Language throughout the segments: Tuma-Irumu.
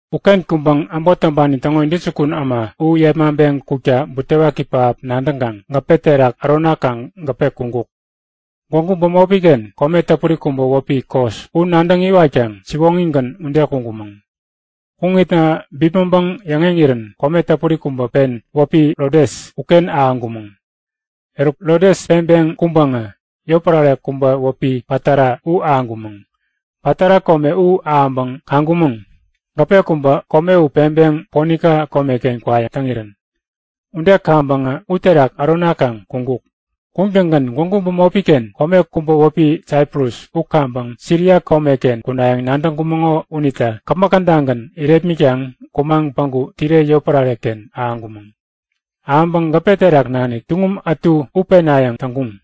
Uken kuŋpäŋ äbot täŋpani täŋo intäjukun äma u yepmaŋpeŋ kukta butewaki pähap nadäŋkaŋ gäpe terak äronakaŋ gäpe kuŋkuk. Gwägu bämopi-ken kome täpuri kubä wäpi Kos u nadäŋ iwatkaŋ siwoŋigän ude kuŋkumäŋ. Kuŋitna bipmäŋpäŋ yäŋeŋirän kome täpuri kubä pen wäpi Rodes uken ahäŋkumäŋ. Eruk Rodes peŋpeŋ kuŋpäŋä yotpärare kubä wäpi Patara u ahäŋkumäŋ. Patara kome u ahäŋpäŋ kaŋkumäŋ. Gäpe kubä kome u peŋpeŋ Ponika komeken kwayäŋ täŋirän. Ude kaŋpäŋä uterak äronakaŋ kuŋkuk. Kuŋtäŋgän gwägu bämopi-ken kome kubä wäpi Saiprus u kaŋpäŋ Siria komeken kunayäŋ nadäŋkumäŋo unita käpmäk kädagän irepmitkaŋ kumaŋ päŋku Tire yotpärare-ken ahäŋkumäŋ. Ahäŋpäŋ gäpe terak nanik tuŋum ätu u penayäŋ täŋkuŋ.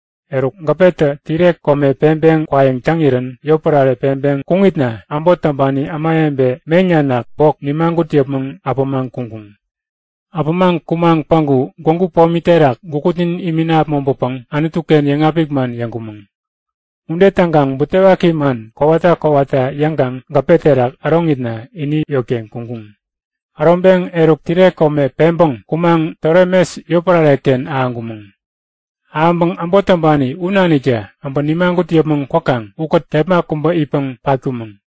Eruk gäpetä Tire kome peŋpeŋ kwayäŋ täŋirän yotpärare peŋpeŋ kuŋitna äbot täŋpani ämawebe meŋ nanak bok nimagut yäpmäŋ äpämaŋ kuŋkuŋ. Äpämaŋ kumaŋ päŋku gwägu pomi terak gukutnin imina äpmoŋpäpäŋ Anutu-ken yäŋapik man yäŋkumäŋ. Ude täŋkaŋ butewaki man kowata kowata yäŋkaŋ gäpe terak äroŋitna ini yotken kuŋkuŋ. Äroŋpeŋ eruk Tire kome peŋpäŋ kumaŋ Tolemes yotpärare-ken ahäŋkumäŋ. Ahäŋpäŋ äbot täŋpani u naniktä äbä nimagut yäpmäŋ kwäkaŋ ukät kepma kubä itpäŋ patkumäŋ.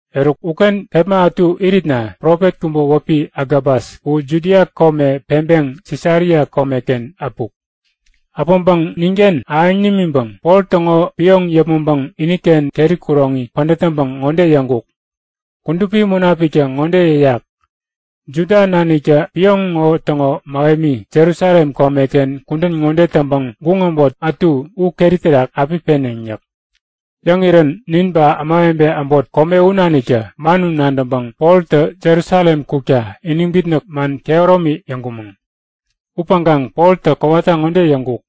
Eruk, uken kepma ätu iritna profet kubä wäpi Agabas u Judia kome peŋpeŋ Sisaria komeken äpuk. Äpäŋpäŋ ninken ahäŋ nimiŋpäŋ Pol täŋo pioŋ yäpmäŋpäŋ iniken keri kuroŋi pädät täŋpäŋ ŋode yäŋkuk; Kudupi Munapiktä ŋode yäyak; Juda naniktä pioŋ ŋo täŋo mähemi Jerusalem komeken kudän ŋode täŋpäŋ guŋ äbot ätu u keri terak api peneŋ yäk. Yäŋirän nin ba ämawebe äbot kome u naniktä man u nadäŋpäŋ Poltä Jerusalem kukta iniŋ bitnäk man kehäromi yäŋkumäŋ. Upäŋkaŋ Poltä kowata ŋode yäŋkuk;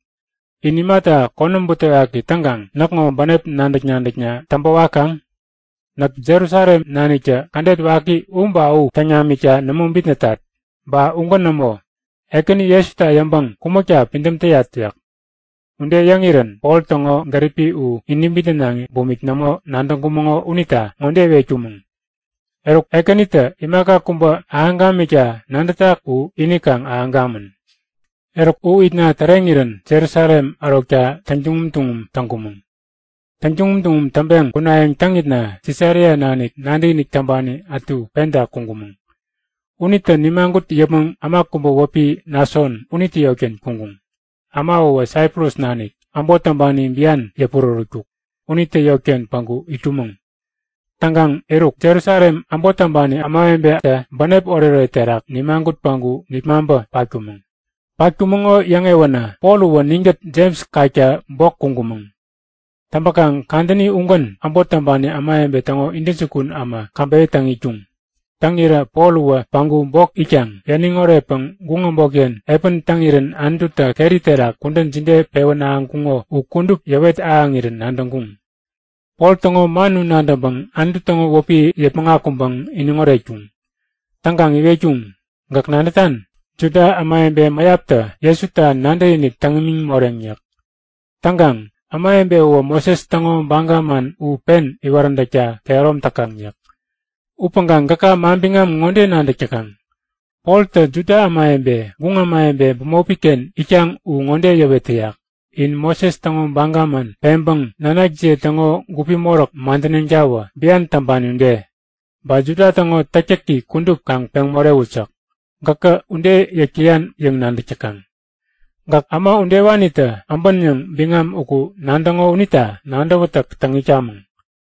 In imata konäm butewaki täŋkaŋ näkŋo bänep nadäk-nadäkna täŋpä wakaŋ? Näk Jerusalem naniktä kädet waki u ba u täŋ namikta nämo bitnätat. Ba ugän nämo. Ekäni Jesuta yäŋpäŋ kumäkta pidäm täyat yäk. Ude yäŋirän Pol täŋo gäripi u iniŋ bitnänaŋi bumik nämo nadäŋkumäŋo unita ŋode iwetkumäŋ; Eruk, Ekänitä imaka kubä ahäŋ gamikta nadätak u ini kaŋ ahäŋ gamän. Eruk u itna täreŋirän Jerusalem ärokta täŋtuŋum tuŋum täŋkumäŋ. Täŋtuŋum tuŋum täŋpeŋ kunayäŋ täŋitna Sisaria nanik nadäkinik täŋpani ätu penta kuŋkumäŋ. Unitä nimagut yäpmäŋ äma kubä wäpi Nason unitä yotken kuŋkuŋ. Äma uwä Saiprus nanik, äbot täŋpani bian yäpurärätkuk. Unitä yotken päŋku itkumäŋ. Täŋkaŋ eruk, Jerusalem äbot täŋpani ämawebetä bänep oretoret terak nimagut päŋku nipmaŋpä patkumäŋ. Patkumäŋo yäŋewänä Pol uwä ninkät Jems kakta bok kuŋkumäŋ. Täŋpäkaŋ kadäni ugän äbot täŋpani ämawebe täŋo intäjukun äma käbeyä täŋ itkuŋ. Täŋirä Pol uwä päŋku bok itkaŋ yäniŋ oretpäŋ guŋ äbotken epän täŋirän Anututä keri terak kudän jide pewän ahäŋkuŋo u kudup yäwet ahäŋirän nadäŋkuŋ. Pol täŋo man u nadäŋpäŋ Anutu täŋo wäpi yäpmäŋ akuŋpäŋ iniŋ oretkuŋ. Täŋkaŋ iwetkuŋ; Gäk nadätan? Juda ämawebe mäyaptä Jesuta nadäkinik täŋ imiŋ moreŋ yäk. Täŋkaŋ ämawebe uwä Moses täŋo baga man u pen iwaräntäkta kehärom täkaŋ yäk. Upäŋkaŋ gäka manbiŋam ŋode nadäk täkaŋ; Poltä Juda ämawebe, guŋ ämawebe bämopi-ken itkaŋ u ŋode yäwet täyak; In Moses täŋo baga man peŋpäŋ nanakjiye täŋo gupi moräk madäneŋtawä, bian täŋpani ude. Ba Juda täŋo täktäki kudup kaŋ peŋ morewut yäk. Gäkä ude yäk täyan yäŋ nadäk täkaŋ. Gäk äma udewanitä abän yäŋ biŋam uku nadäŋo unita nadäwätäk täŋ itkamäŋ.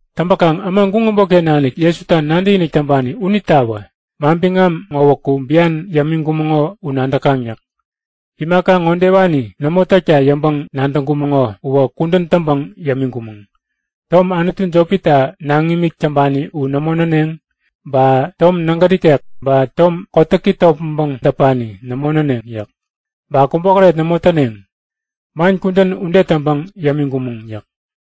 Täŋpäkaŋ äma guŋ äbotken nanik Jesuta nadäkinik täŋpani unitawä, manbiŋam ŋowäku bian yämiŋkumäŋo u nadäkaŋ yäk. Imaka ŋodewani nämo täkta yäŋpäŋ-nadäŋkumäŋo uwä kudän täŋpäŋ yämiŋkumäŋ; Tom anutu jopita naŋimik täŋpani u nämo näneŋ. Ba tom nägät ikek ba tom kotäki topmäŋpäŋ däpani nämo näneŋ yäk. Ba kubokäret nämo täneŋ. Man kudän ude täŋpäŋ yämiŋkumäŋ yäk.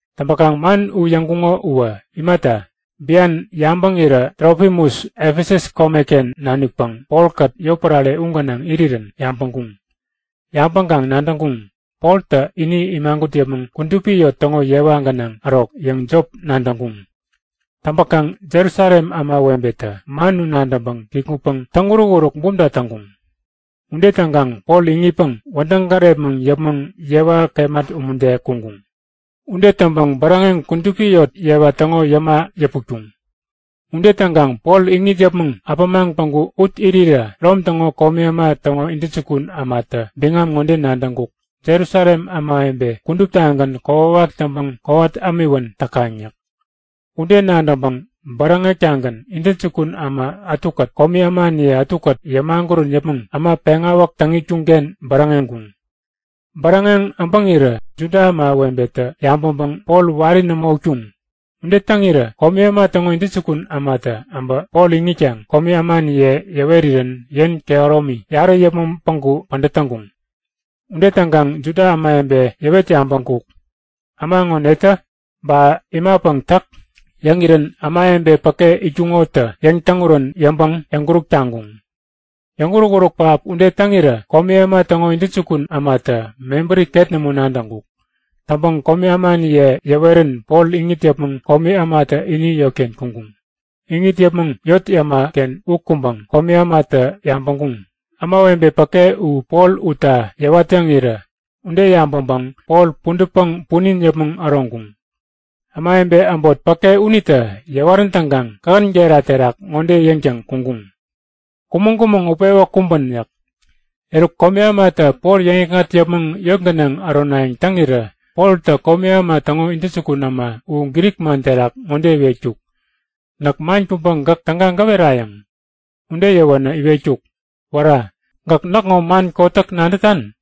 Täŋpäkaŋ man u yäŋkuŋo uwä imata, bian yabäŋirä Trofimus Efesus komeken nanikpäŋ Polkät yotpärare u gänaŋ irirän yabäŋkuŋ. Yabäŋkaŋ nadäŋkuŋ; Poltä ini imagut yäpmäŋ kudupi yot täŋo yewa gänaŋ ärok yäŋ jop nadäŋkuŋ. Täŋpäkaŋ Jerusalem ämawebetä man u nadäŋpäŋ kikŋutpäŋ täŋ-urukuruk bumta täŋkuŋ. Ude täŋkaŋ Pol iŋitpäŋ wädäŋ gärepmäŋ yäpmäŋ yewa kemat umude kuŋkuŋ. Ude täŋpäŋ bäräŋeŋ kudupi yot yewa täŋo yäma yäputkuŋ. Ude täŋkaŋ Pol iŋit yäpmäŋ äpämaŋ päŋku ut irirä Rom täŋo komi äma täŋo intäjukun ämatä biŋam ŋode nadäŋkuk; Jerusalem ämawebe kuduptagän kokwawak täŋpäŋ kowat ämiwän täkaŋ yäk. Ude nadäŋpäŋ bäräŋek-tagän intäjukun äma ätukät komi ämaniye ätukät yämagurän yäpmäŋ äma peŋawäk täŋ itkuŋ-ken bäräŋeŋkuŋ. Bäräŋeŋ äbäŋirä Juda ämawebetä yabäŋpäŋ Pol wari nämo utkuŋ. Ude täŋirä komi äma täŋo intäjukun ämatä äbä Pol iŋitkaŋ komi ämaniye yäwerirän yen kehäromi yarä yäpmäŋ päŋku pädät täŋkuŋ. Ude täŋkaŋ Juda ämawebe yäwet yabäŋkuk; Äma ŋo netä? Ba imapäŋ täk? Yäŋirän ämawebe äbot päke itkuŋotä yäŋ-täŋurän yäŋpäŋ yäŋkuräk taŋkuŋ. Yäŋuruk-uruk pähap ude täŋirä komi äma täŋo intäjukun ämatä mebäri ket nämo nadäŋkuk. Täŋpäŋ komi ämaniye yäwerän Pol iŋit yäpmäŋ komi ämatä ini yotken kuŋkuŋ. Iŋit yäpmäŋ yot yäma-ken u kuŋpäŋ komi ämatä yabäŋkuŋ; Ämawebe päke u Pol utta yäwat-yäŋirä ude yabäŋpäŋ Pol pudätpäŋ punin yäpmäŋ äroŋkuŋ. Ämawebe äbot päke unitä yäwarän täŋkaŋ kähän gera terak ŋode yäŋtäŋ kuŋkuŋ; Kumäŋ-kumäŋ utpewä kumbän! yäk. Eruk komi ämatä Pol yäŋikŋat yäpmäŋ yot gänaŋ äronayäŋ täŋirä Poltä komi äma täŋo intäjukun äma u Grik man terak ŋode iwetkuk; Näk man kubä gäk täga gäwerayäŋ? Ude yäwänä iwetkuk; Wära, gäk näkŋo man kotäk nadätan?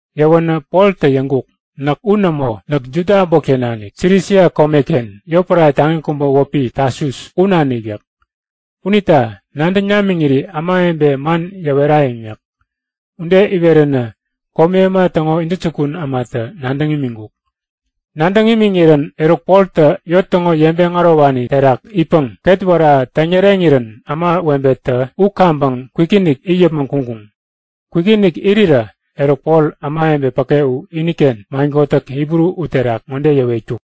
Yäwänä Poltä yäŋkuk; Näk u nämo! Näk Juda äbotken nanik, Silisia komeken, yotpärare taŋi kubä wäpi Tasus u nanik yäk. Unita nadäŋ namiŋiri ämawebe man yäwerayäŋ yäk. Ude iweränä komi äma täŋo intäjukun ämatä nadäŋ imiŋkuk. Nadäŋ imiŋirän, eruk Poltä yot täŋo yeŋpeŋ ärowani terak itpäŋ ketwära täŋyäreŋirän ämawebetä u kaŋpäŋ kwikinik it yäpmäŋ kuŋkuŋ. Kwikinik irirä eruk Pol ämawebe päke u iniken man kotäk Hibru uterak ŋode yäwetkuk;